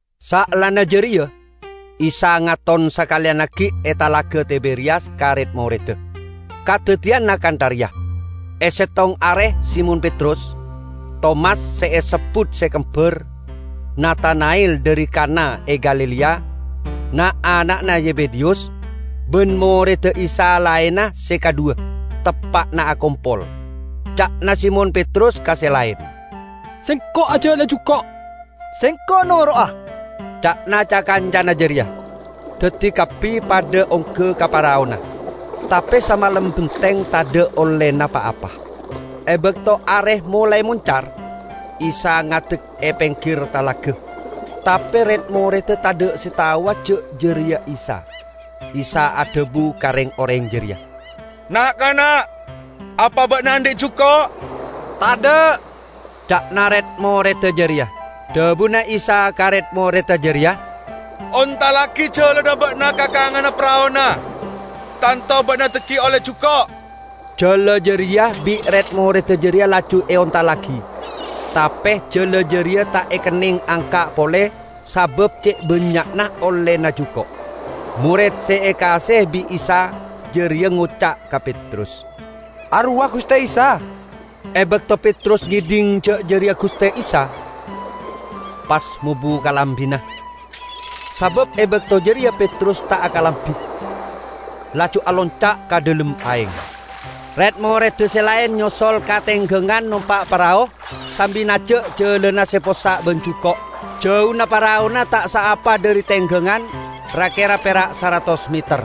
Saellana jareya Isa ngaton sakaleyan aggi' e Talaga Tiberiyas ka red-moredda. Kadaddiyanna kantha reya: E settong are Simon Petrus, Tomas se esebbut Se Kembar, Natana'el dhari Kanna e Galilea, na'-ana'na Zebedeyus, ban moredda Isa laenna se kadhuwa, teppa'na akompol. Ca'na Simon Petrus ka se laen, "Sengko' ajala'a juko'." "Sengko' noro'a," ca'na ca-kancana jareya. Daddi kabbi padha ongga ka paraona. Tape samalem benteng tadha' ollena pa-apa. E bakto are molae moncar, Isa ngadek e penggir talaga, tape red-moredda tadha' se taowa ja' jareya Isa. Isa adhabu ka reng-oreng jareya, "Na'-kana', apa ba'na andhi' juko'?" "Tadha'," ca'na red-moredda jareya. Dhabuna Isa ka red-moredda jareya, "Ontallagi jalana ba'na ka kanganna paraona, tanto ba'na dhaggi' olle juko'." Jala jareya bi' red-moredda jareya laju eontallagi; tape jala jareya ta' ekenneng angka' pole sabab ce' bannya'na ollena juko'. Mored se ekaase'e bi' Isa jareya ngoca' ka Petrus, "Arowa Guste Isa!" E bakto Petrus ngedhing ja' jareya Guste Isa, pas mobu kalambina (sabab e bakto jareya Petrus ta' akalambi), laju alonca' ka dhalem aeng. Red-moredda se laen nyosol ka tenggangan nompa' parao, sambi naja' jalana se possa' ban juko'. Jauna paraona ta' saapa dhari tenggangan, ra-kera pera' saratos meter.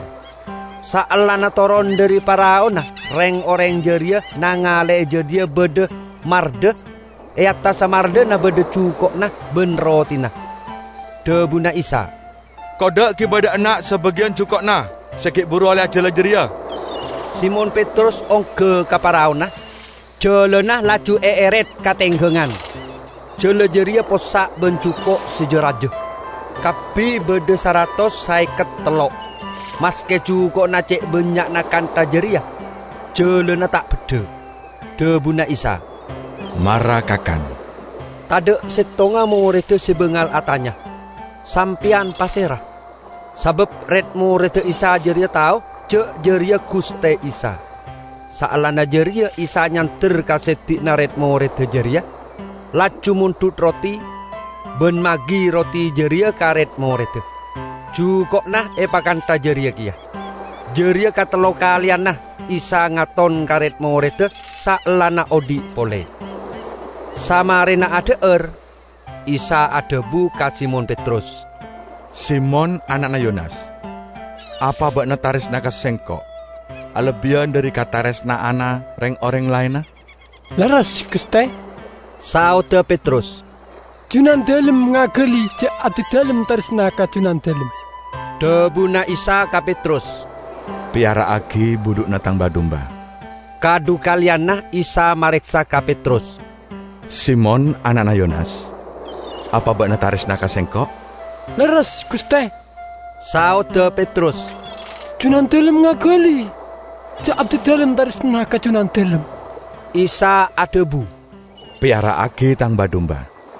Saellana toron dhari paraona reng-oreng jareya nangale e jadhiya badha mardha, e attassa mardhana badha juko'na ban rotina. Dhabuna Isa, "Kodda' giba dha' enna' sabagiyan juko'na se gi' buru olle ajala jareya." Simon Petrus ongga ka paraona, jalana laju eeret ka tenggangan. Jala jareya possa' ban juko' se ja-raja; kabbi badha saratos saeket tello'. Maske juko'na ce' bannya'na kantha jareya, jalana ta' beddha. Dhabuna Isa, "Mara kakan." Tadha' settonga moredda se bangal atanya, "Sampeyan pasera?" Sabab red-moredda Isa jareya tao ja' jareya Guste Isa. Saellana jareya Isa nyander ka seddi'na red-moredda jareya, laju mondhut roti, ban magi roti jareya ka red-moredda. Juko'na epakantha jareya keya. Jareya katello kaleyanna Isa ngaton ka red-moredda saellana odhi' pole. Samarema adha'ar, Isa adhabu ka Simon Petrus, "Simon ana'na Yonas, apa ba'na taresna ka Sengko' alebbiyan dhari kataresna'anna reng-oreng laenna?" "Lerres, Guste," saodda Petrus. "Junandalem ngagali ja' abdidalem taresna ka Junandalem." Dhabuna Isa ka Petrus, "Peyara'agi budhu'na Tang ba-dumba." Kadhukaleyanna Isa mareksa ka Petrus, "Simon ana'na Yonas, apa ba'na taresna ka Sengko'?" "Lerres, Guste," saodda Petrus, "Junandalem ngagali ja' abdidalem taresna ka Junandalem." Isa adhabu, "Peyara'agi Tang ba-dumba."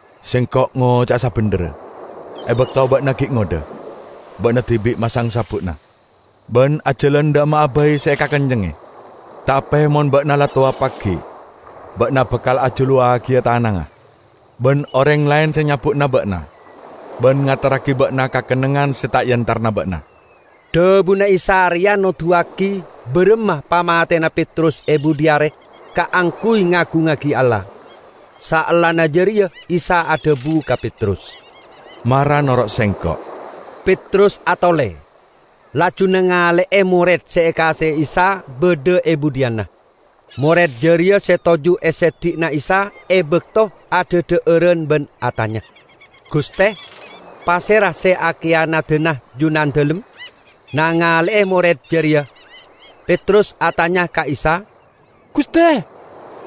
Sengko' ngoca'a sabendherra: E bakto ba'na gi' ngodha, ba'na dibi' masang sabbu'na, ban ajalan dha' emma'a bai se ekakencengnge. Tape mon ba'na la towa pagi', ba'na bakal ajuluwagiya tanangnga, ban oreng laen se nyabbu'ana ba'na ban ngaterragi ba'na ka kennengngan se ta' eentarana ba'na." (Dhabuna Isa reya noduwagi baramma pamatena Petrus e budhi are kaangguy ngagungngagi Allah.) Saellana jareya Isa adhabu ka Petrus, "Mara noro' Sengko'!" Petrus atole, laju nangale'e mored se ekaase'e Isa badha e budhiyanna. (Mored jareya se toju' e seddi'na Isa e bakto adhadha'aran ban atanya, "Guste, pasera se akiyanadana Junandalem?") Nangale'e mored jareya, Petrus atanya ka Isa, "Guste,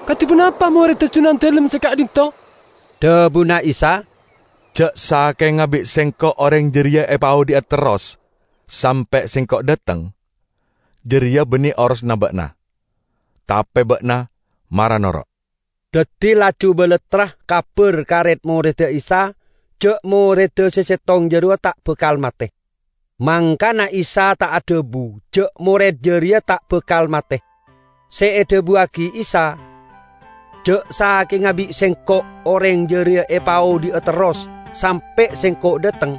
kadi ponapa moredda Junandalem se ka'dhinto'?" Dhabuna Isa, "Ja' sakenga bi' Sengko' oreng jareya epaodhi'a terros sampe' Sengko' dhateng, jareya banne orosanna ba'na. Tape ba'na, mara noro'!" Daddi laju balattra kabar ka red-moredda Isa ja' moredda se settong jarowa ta' bakal mate. Mangkana Isa ta' adhabu ja' mored jareya ta' bakal mate; se edhabuwagi Isa, "Ja' sakenga bi' Sengko' oreng jareya epaodhi'a terros sampe' Sengko' dhateng,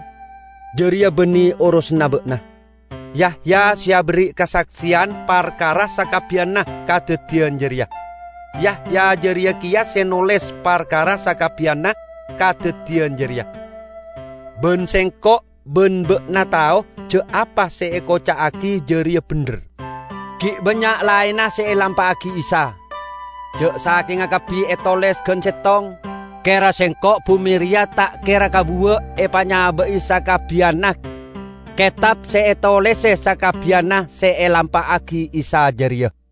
jareya banne orosanna ba'na." Yahya se aberri' kasakseyan parkara sakabbiyanna kadaddiyan jareya. Yahya jareya keya se noles parkara sakabbiyanna kadaddiyan jareya. Ban sengko' ban ba'na tao ja' apa se ekoca'agi jareya bendher. Gi' bannya' laenna se elampa'agi Isa. Ja' sakenga kabbi etoles gan settong, kera sengko' bume reya ta' kera kabuwa' epanyaba'i sakabbiyanna ketab se etolese sakabbiyanna se elampa'agi Isa jareya.